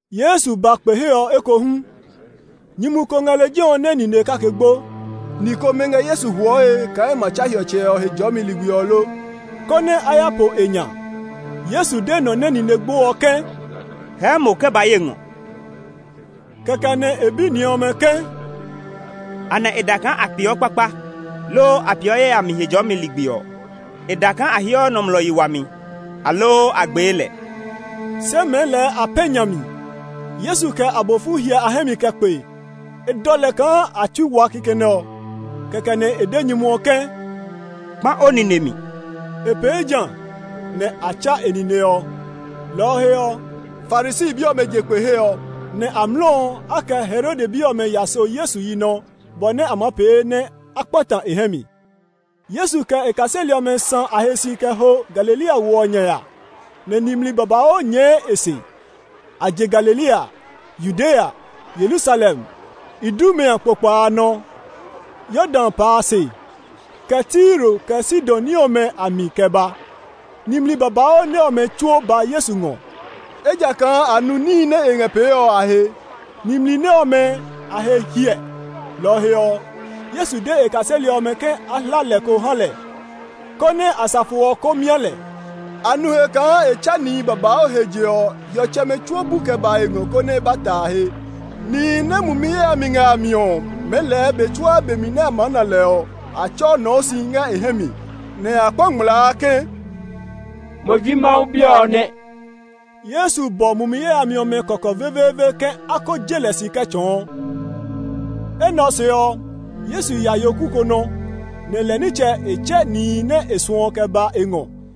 Yesu ba kpe he ɔ ekohu. Nyumu ko ngɛ lejɛ ɔ nɛ nine kake gbo. Ni komɛ ngɛ Yesu huɔe kaa e ma tsa hiɔtsɛ ɔ Hejɔɔmi ligbi ɔ lo, konɛ a ya po e nya. Yesu de nɔ nɛ nine gbo ɔ ke, “Hɛɛ mo kɛ ba ye ngɔ!” Kɛkɛ nɛ e bi ni ɔmɛ ke, “Anɛ e da kaa a peeɔ kpakpa, loo a peeɔ yayami Hejɔɔmi ligbi ɔ; e da kaa a heɔ nɔmlɔ yi wami, aloo a gbee lɛ?” Se mɛɛ lɛɛ a pɛ̃ nya mi. Yesu kɛ abofu hyɛ a hɛ mi kɛ kpe; e dɔ lɛ kaa a tsui wa kikɛ nɛ ɔ. Kɛkɛ nɛ e de nyumu ɔ ke, “Kpã o nine mi!” E pee ja; nɛ a tsa e nine ɔ. Lɔ ɔ he ɔ, Farisi bi ɔmɛ je kpe he ɔ, nɛ amlɔ ɔ, a kɛ Herode bi ɔmɛ ya so Yesu yi nɔ, bɔ nɛ a maa pee nɛ a kpata e hɛ mi. Yesu kɛ e kaseli ɔmɛ sã a he si kɛ ho Galilea wo ɔ nya ya, nɛ nimli babauu nyɛɛ e se. A je Galilea, Yudea, Yerusalem, Idumea kpokpa a nɔ, Yordan pa a se, kɛ Tiro kɛ Sidon ní ɔmɛ a mi kɛ ba. Nimli babauu nɛ ɔmɛ tsuo ba Yesu ngɔ, ejakaa a nu níhi nɛ e ngɛ pee ɔ a he. Nimli nɛ ɔmɛ a he hiɛ, lɔ ɔ he ɔ, Yesu de e kaseli ɔmɛ ke a hla lɛ ko ha lɛ, konɛ asafo ɔ ko mia lɛ. A nu he kaa e tsa nihi babauu he je ɔ, hiɔtsɛmɛ tsuo bu kɛ ba e ngɔ konɛ a ba ta e he. Nihi nɛ mumi yayami ngɛ a mi ɔ, mɛɛ lɛɛ be tsuaa be nɛ a maa na lɛ ɔ, a tsɔɔ nɔɔ si ngɛ e hɛ mi, nɛ a kpaa ngmlaa ke, “Mo ji Mawu Bi ɔ nɛ!” Yesu bɔ mumi yayami ɔmɛ kɔkɔ veveeve ke a ko je lɛ si kɛ tsɔɔ. Enɛ ɔ se ɔ, Yesu ya yoku ko nɔ, nɛ lɛ nitsɛ e tsɛ nihi nɛ e suɔ ɔ kɛ ba e ngɔ.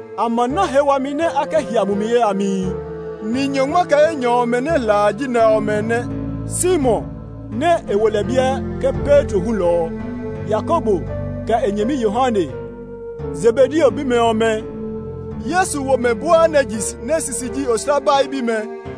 A ma na he blɔ nɛ a kɛ hia mumi yayamihi. Ni nyɔngma kɛ enyɔ ɔmɛ nɛ e hla a ji nɛ ɔmɛ nɛ: Simon, (nɛ e wo lɛ biɛ ke Petro hulɔ ɔ), Yakobo, kɛ e nyɛmi Yohane, Zebedeo bimɛ ɔmɛ (Yesu wo mɛ Boanerges. E sisi ji oslabai bimɛ),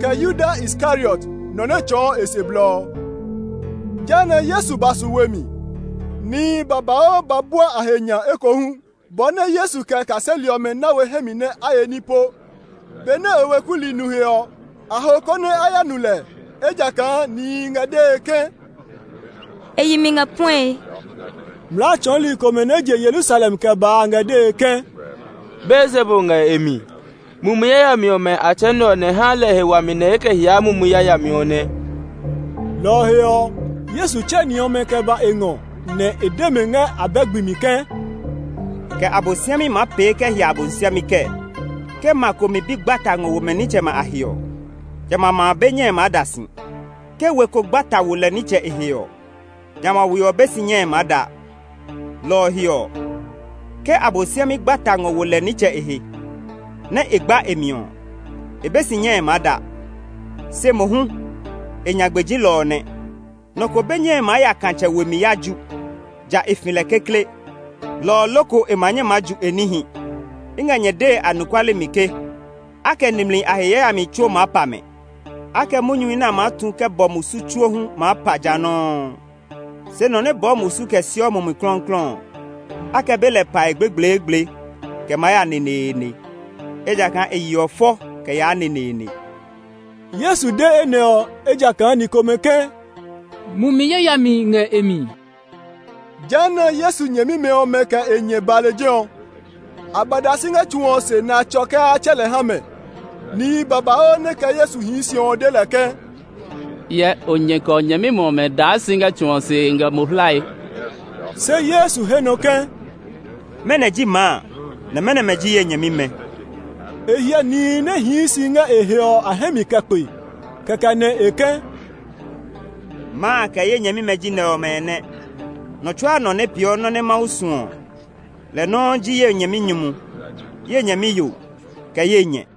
kɛ Yuda Iskariot, nɔ nɛ tsɔɔ e se blɔ ɔ. Jehanɛ Yesu ba su we mi. Nihi babauu ba bua a he nya ekohu bɔ nɛ Yesu kɛ e kaseli ɔmɛ na we hɛ mi nɛ a ye ní po. Benɛ e weku li nu he ɔ, a ho konɛ a ya nu lɛ, ejakaa nihi ngɛ dee ke, “E yi mi ngɛ puɛe!” Mlaa tsɔli komɛ nɛ je Yerusalem kɛ ba a ngɛ dee ke, “Beelzebul ngɛ e mi. Mumi yayami ɔmɛ a tsɛ nɛ ɔ nɛ haa lɛ he wami nɛ e kɛ hiaa mumi yayami ɔ nɛ.” Lɔ ɔ he ɔ, Yesu tsɛ ni ɔmɛ kɛ ba e ngɔ, nɛ e de mɛ ngɛ abɛ gbi mi ke, “Kɛ Abosiami maa pee kɛ hia Abosiami kɛɛ? Ke ma ko mi bi gba ta ngɔ wo mɛ nitsɛmɛ a he ɔ, jamɛ a ma a be nyɛe maa da si. Ke we ko gba ta wo lɛ nitsɛ e he ɔ, jamɛ a we ɔ be si nyɛe maa da. Lɔ ɔ he ɔ, ke Abosiami gba ta ngɔ wo lɛ nitsɛ e he, nɛ e gba e mi ɔ, e be si nyɛe maa da, se mohu e nyagbe ji lɔ ɔ nɛ. “Nɔ ko be nyɛe maa ya katsɛ we mi ya ju, ja e fi lɛ kekle, lɔ ɔ loko e ma nyɛ maa ju e níhi. “I ngɛ nyɛ dee anɔkuale mi ke, a kɛ nimli a he yayamihi tsuo maa pa mɛ; a kɛ munyuhi nɛ a maa tu kɛ bɔ musu tsuo hu maa pa ja nɔuu. Se nɔ nɛ bɔɔ musu kɛ siɔ Mumi Klɔuklɔu ɔ, a kɛ be lɛ pae gblegbleegble kɛ maa ya neneene; ejakaa e yeɔ fɔ kɛ yaa neneene.” (Yesu de enɛ ɔ, ejakaa ni komɛ ke, “Mumi yayami ngɛ e mi.”) Jehanɛ Yesu nyɛmimɛ ɔmɛ kɛ e nyɛ ba lejɛ ɔ. A ba da si ngɛ tsu ɔ se nɛ a tsɔ ke a tsɛ lɛ ha mɛ. Nihi babauu nɛ kɛ Yesu hii si ɔ de lɛ ke, “Hyɛ, o nyɛ kɛ o nyɛmimɛ ɔmɛ daa si ngɛ tsu ɔ se ngɛ mo hlae.” Se Yesu he nɔ ke, “Mɛnɔ ji maa, nɛ mɛnɔmɛ ji ye nyɛmimɛ?” E hyɛ nihi nɛ hii si ngɛ e he ɔ a hɛ mi kɛ kpe, kɛkɛ nɛ e ke, “Maa, kɛ ye nyɛmimɛ ji nɛ ɔmɛ nɛ! Nɔ tsuaa nɔ nɛ peeɔ nɔ́ nɛ Mawu suɔ ɔ, lɛ nɔuu ji ye nyɛminyumu, ye nyɛmiyo, kɛ ye nyɛ.”